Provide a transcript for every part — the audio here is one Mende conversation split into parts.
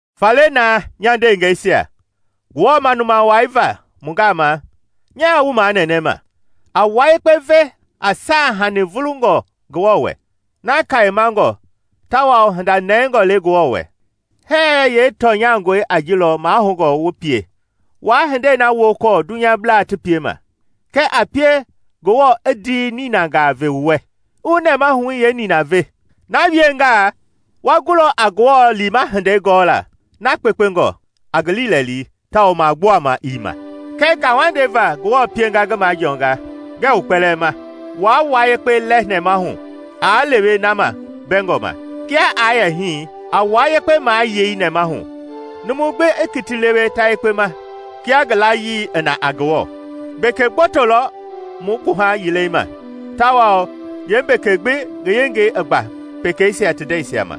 Faale naa, nya ndeengɛisia, Ngewɔ manuma wai va mu gama, nyaa wu manɛnɛma: a wua yekpe ve a saahanii vulungɔ Ngewɔ wɛ, na Kayemangɔ tawao hinda nɛingɔ le Ngewɔ wɛ. Hɛɛ yeetɔnyangɔi a ji lɔ mahoungɔ wu pie. Waa hindei na wokɔɔ dunyablaa ti piema, kɛɛ a pie Ngewɔ i ndii ninangaa ve wu wɛ, i wu nɛmahui yeenina ve. Na wiengaa wa gulɔ a Ngewɔ liima hindei gɔɔla na kpekpengɔ, a ngi liilɛli tawao magbuama ii ma. Kɛ ngauwandei va Ngewɔ pienga ngi majɔɔngɔ, ngɛɛ wu kpɛlɛɛ ma: waa wua yekpe lɛ nɛmahu aa lewe na ma mbɛngɔ ma. Kia aa yɛ hii, a wua yekpe mayei nɛmahu, numu gbi i kiti lewe ta yekpe ma kia ngi layii i na a Ngewɔ. Mbeke gboto lɔ mu gbuha yilei ma, tawao yeembeke gbi ngi yengei i gba pekeisia ti ndɛisia ma.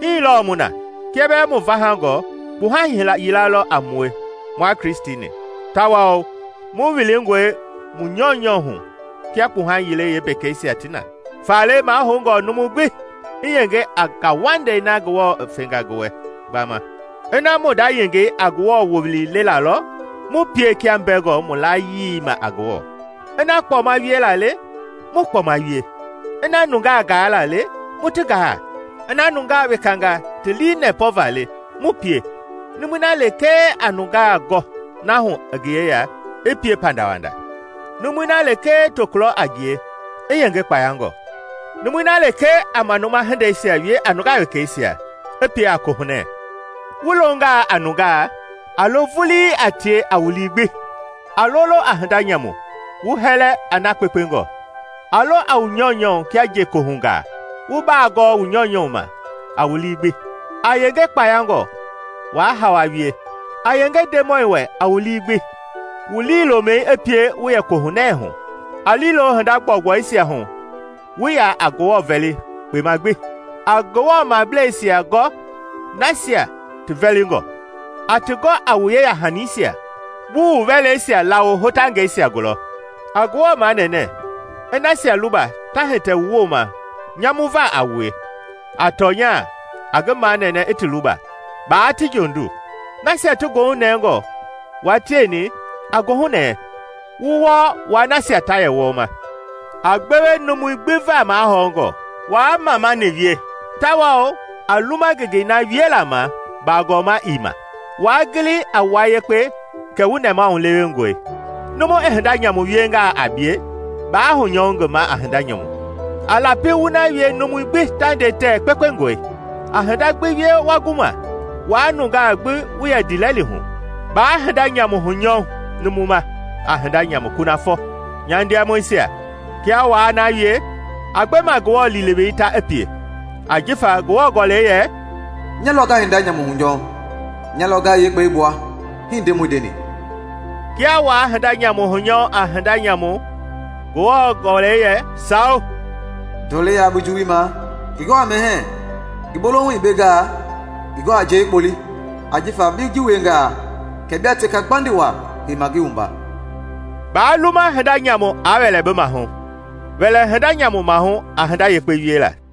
Hii lɔɔ mu na, kia bɛɛ mu vahangɔ, kpuha yila lɔ a mue mua Kristi-ni, tawao mu wilingɔe mu nyɔunyɔ hu kia kpuha yilei yeembekeisia ti na. Faale mahoungɔ numu gbi i yenge a ngauwandei na Ngewɔ i fenga ngi wɛ gbama. Ina mu nda yengei a Ngewɔ wowili lelaa lɔ, mu pie kia mbɛngɔ mu layii ma a Ngewɔ. Ina kpɔma wiela le, mu kpɔma wie. Ina nungaa gaala le, mu ti gaa. Ina nungaa wekangaa ti lii nɛpɔ va le, mu pie. Numui na lekee a nungaa gɔ na hu i ngi yeya, i pie a pandawanda; numui na lekee tokulɔ a ngie, i yenge kpayangɔ; numui na lekee a manuma hindeisia wie a nungaa wekeisia, i pie a kohunɛ. Wu longaa a nungaa, a lo vulii a tie a wu lii gbi. A lolo a hinda nyamu, wu hɛlɛ a na kpekpengɔ. A lo a wu nyɔunyɔ kia njekohungaa, wu baa gɔɔ wu nyɔunyɔ ma a wu lii gbi. A yenge kpayangɔ, waa hawa wie. A yenge Ndemɔi wɛ a wu lii gbi. Wu liilomɛi i pie wu yɛ kohunɛ hu, a liilo hinda gbɔugbɔisia hu wu yɛ a Ngewɔ vɛli kpema gbi. A Ngewɔ mableisia gɔ ti vɛlingɔ, a ti gɔ a wu yeya-hanisia, wu wu wɛleisia lawo hotangɛisia gulɔ. A Ngewɔ manɛnɛ i nasia luba ta hitɛ wu wooma nyamuva a wue; a tɔnya, a ngi manɛnɛ i ti luba, baa ti jondu. Nasia ti goohunɛngɔ, wua tieni a goohunɛɛ, wu wɔɔ wua nasia ta yɛ wɔɔma. A gbewe numui gbi va mahɔngɔ. Waa mamani wie, tawao a luma ngenge na wiela ma bagɔma ii ma. Waa gili a wua yekpe kɛ wu nɛmahulewengɔe. Numu i hinda nyamu wiengaa a bie, baa hunyɔu ngi ma a hinda nyamu. A lapi wu na wie numui gbi ta nde tɛɛ kpekpengɔe. A hinda gbi wie wa gu ma, wua nungaa gbi wu yɛ ndiilɛli hu. Baa hinda nyamu hunyɔu numu ma a hinda nyamu kunafɔ, nya ndiamɔisia, kia waa na wie, a gbe ma Ngewɔ liilewei ta i pie. Ajifa Ngewɔ Gɔlɛi yɛ, “ ‘Nya lɔ nga hinda nyamu hunyɔu, nya lɔ nga yee kpɛi gbua,’ hii Ndemɔi ndeni.” Kia waa hinda nyamu hunyɔu a hinda nyamu, Ngewɔ Gɔlɛi yɛ, sao, “Ndɔlei yaa bi juwui ma, ngi gɔ a mɛhɛɛ; ngi bolohu i bengaa, ngi gɔ a njɛi i kpɔle; ajifa bi ji wiengaa kɛ bia teka gbandi waa heima ngi wumba.” Baa luma hinda nyamu aa wɛlɛ bi mahu, wɛlɛ hinda nyamu mahu a hinda yekpe wiela.